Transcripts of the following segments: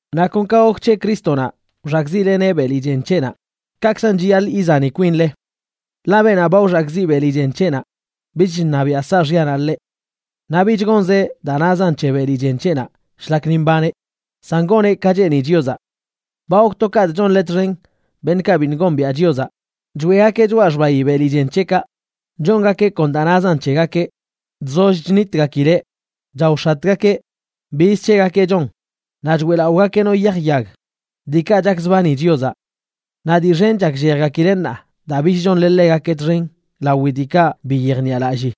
Naꞌ kon ka gok c̱he Crístonaꞌ wxakꞌziꞌleneꞌ beli chen c̱heꞌnaꞌ, kaꞌkzan chiyaḻꞌ izani kwinle. Ḻaꞌ beenaꞌ ba wxakꞌziꞌ beli chen c̱heꞌnaꞌ bich chṉabiaꞌ saaxyanaꞌ ḻeꞌ. Naꞌ bich gonzeꞌ daa nazan c̱he beli chen c̱heꞌnaꞌ shlak ni mbaneꞌ, san goneꞌ ka cheeni Chiozaꞌ. Ba gok to kaꞌtꞌ chonle txen beṉꞌkaꞌ biṉꞌ gombiaꞌ Chiozaꞌ, choeꞌgakeꞌ choꞌa xbayi beli chen c̱heꞌkaꞌ, chongakeꞌ kon daa nazan c̱hegakeꞌ, chzoll chnitgakileꞌ, chaox̱atgakeꞌ, biz c̱hegakeꞌ chon, naꞌ choeꞌlaꞌogakeꞌ no yaj yag, diikaꞌ chakzbani Chiozaꞌ. Naꞌ dii xen chakllejgakileꞌ ṉaa daa bich chonle ḻegakeꞌ txen lawi diikaꞌ bi yejniꞌalallii,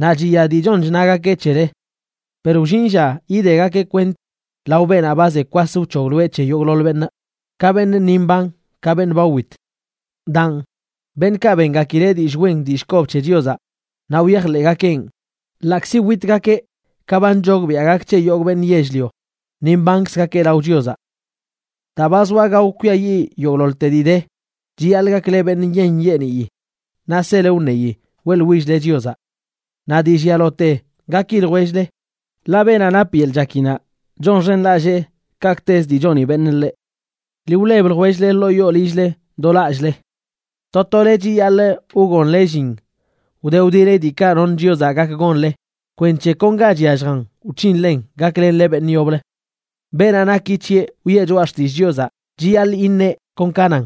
naꞌ chiya dii chon chnagakeꞌ c̱hele. Per wllin lla yidegakeꞌ kwent lao beenaꞌ ba ze kwas wc̱hogloeꞌ c̱he yogꞌḻoḻ beṉꞌ, ka beṉꞌ ni mban ka beṉꞌ ba wit. Daan, beṉꞌkaꞌ bengakileꞌ dillꞌ wen dillꞌ kob c̱he Chiozaꞌ naꞌ wyajḻeꞌgakeꞌn, ḻaꞌkzi witgakeꞌ ka ba nchogbiaꞌ gak c̱he yogꞌ beṉꞌ yell-lio, ni mbankzgakeꞌ lao Chiozaꞌ. Daa ba zoa gao kwiayiꞌ yogꞌḻoḻte dii de, chiyaḻꞌ gakle beṉꞌ nyeeṉ nyeeniyi naꞌ sele wṉeyi weꞌḻwill-le Chiozaꞌ. Naꞌ dii llialote, gaki ljwell-le, ḻaꞌ beenaꞌ nap yeḻꞌ chakinaꞌ chonxenlallee kaꞌkꞌtezə dii choni beṉꞌ ḻeꞌ. Ḻi wleb ljwell-le ḻoo yoo lill-le do lallꞌle. To tole chiyaḻꞌ wgonle llin wde wdeli diikaꞌ noṉ Chiozaꞌ gak gonle kwenc̱he kon ga chyalljan wc̱hinlen gaklenle beṉꞌ yoblə. Beenaꞌ naki c̱heꞌ wiꞌe choꞌa xtillꞌ Chiozaꞌ, chiyaḻꞌ iṉeꞌ kon ka nan.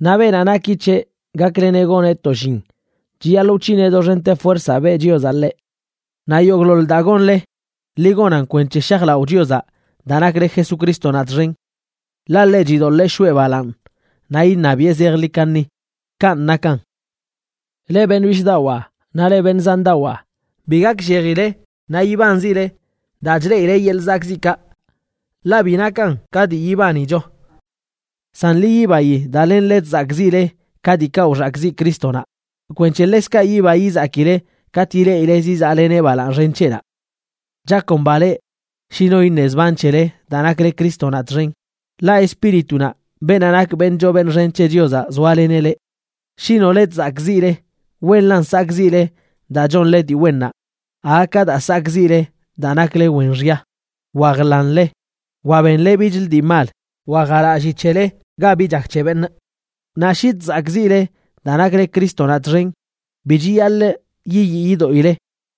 Naꞌ beenaꞌ naki c̱heꞌ gakleneꞌ goneꞌ to llin, chiyaḻꞌ wc̱hineꞌ doxente fuerzaꞌ beꞌ Chiozaꞌ ḻeꞌ. Naꞌ yogꞌḻoḻ daa gonle, ḻi gonan kwenc̱he shajlaꞌo Chiozaꞌ daa nakle Jesucrístonaꞌ txen. Ḻaꞌ ḻeꞌ chidoḻee shoꞌe balaaṉ naꞌ iṉabiꞌe zejḻi kaṉi. Kanꞌ nakan. Leꞌ beṉꞌ bishꞌdawaa naꞌ leꞌ beṉꞌ zandawaa, bi gakllejile naꞌ yibanzile daa chleꞌile yeḻꞌ zakꞌziꞌkaꞌ, ḻaꞌ bi nakan ka dii yibanicho. San ḻi yibayi daa lenle chzakꞌziꞌle ka diikaꞌ wxakꞌziꞌ Crístonaꞌ, kwenc̱he ḻekzkaꞌ yiba yizakile katꞌ ileꞌile zizaꞌleneꞌ balaaṉ xen c̱heꞌnaꞌ. Chakomba leꞌ shi no iṉe zban c̱hele daa nakle Crístonaꞌ txen, ḻaꞌ Espíritunaꞌ, beenaꞌ nak beṉꞌ choo beṉꞌ xen c̱he Chiozaꞌ, zoaleneꞌ leꞌ. Shi nole chzakꞌziꞌle, wenlan sakꞌziꞌle daa chonle dii wennaꞌ aga ka daa sakꞌziꞌle daa nakle wen xya, wa jḻanle, wa benle bichlə dii mal, wa jalalli c̱hele ga bi chak c̱he beṉꞌ. Naꞌ shi chzakꞌziꞌle daa nakle Crístonaꞌ txen, bi chiyaḻꞌ yiyii yidoꞌile,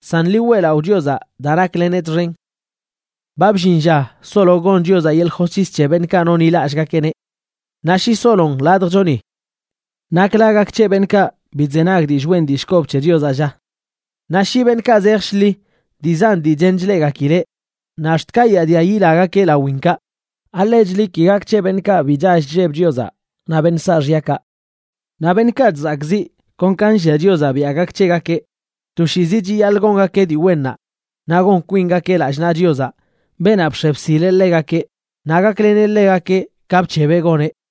san ḻi weꞌlaꞌo Chiozaꞌ daa nakleneꞌ txen. Ba bllin lla solo gon Chiozaꞌ yeḻꞌ josc̱his c̱he beṉꞌkaꞌ nonḻilallꞌgakeꞌneꞌ. Naꞌ shi solon ladjchoni, ¿nakla gak c̱he beṉꞌkaꞌ bi chzenag dillꞌ wen dillꞌ kob c̱he Chiozaꞌ, lla? Naꞌ shi beṉꞌkaꞌ zej shḻi dii zan dii chen chleꞌgakileꞌ naꞌ ax̱t kayaadia yilagakeꞌ lawinkaꞌ, ¿alechli ki gak c̱he beṉꞌkaꞌ bi chall chlleb Chiozaꞌ naꞌ beṉꞌ saaxyakaꞌ? Naꞌ beṉꞌkaꞌ chzakꞌziꞌ kon ka nllia Chiozaꞌ biaꞌ gak c̱hegakeꞌ, toshiizi chiyaḻꞌ gongakeꞌ dii wennaꞌ naꞌ gon kwingakeꞌ lallꞌ naꞌ Chiozaꞌ, beenaꞌ bx̱e bsileꞌ ḻegakeꞌ, naꞌ gakleneꞌ ḻegakeꞌ ka bc̱hebeꞌ goneꞌ.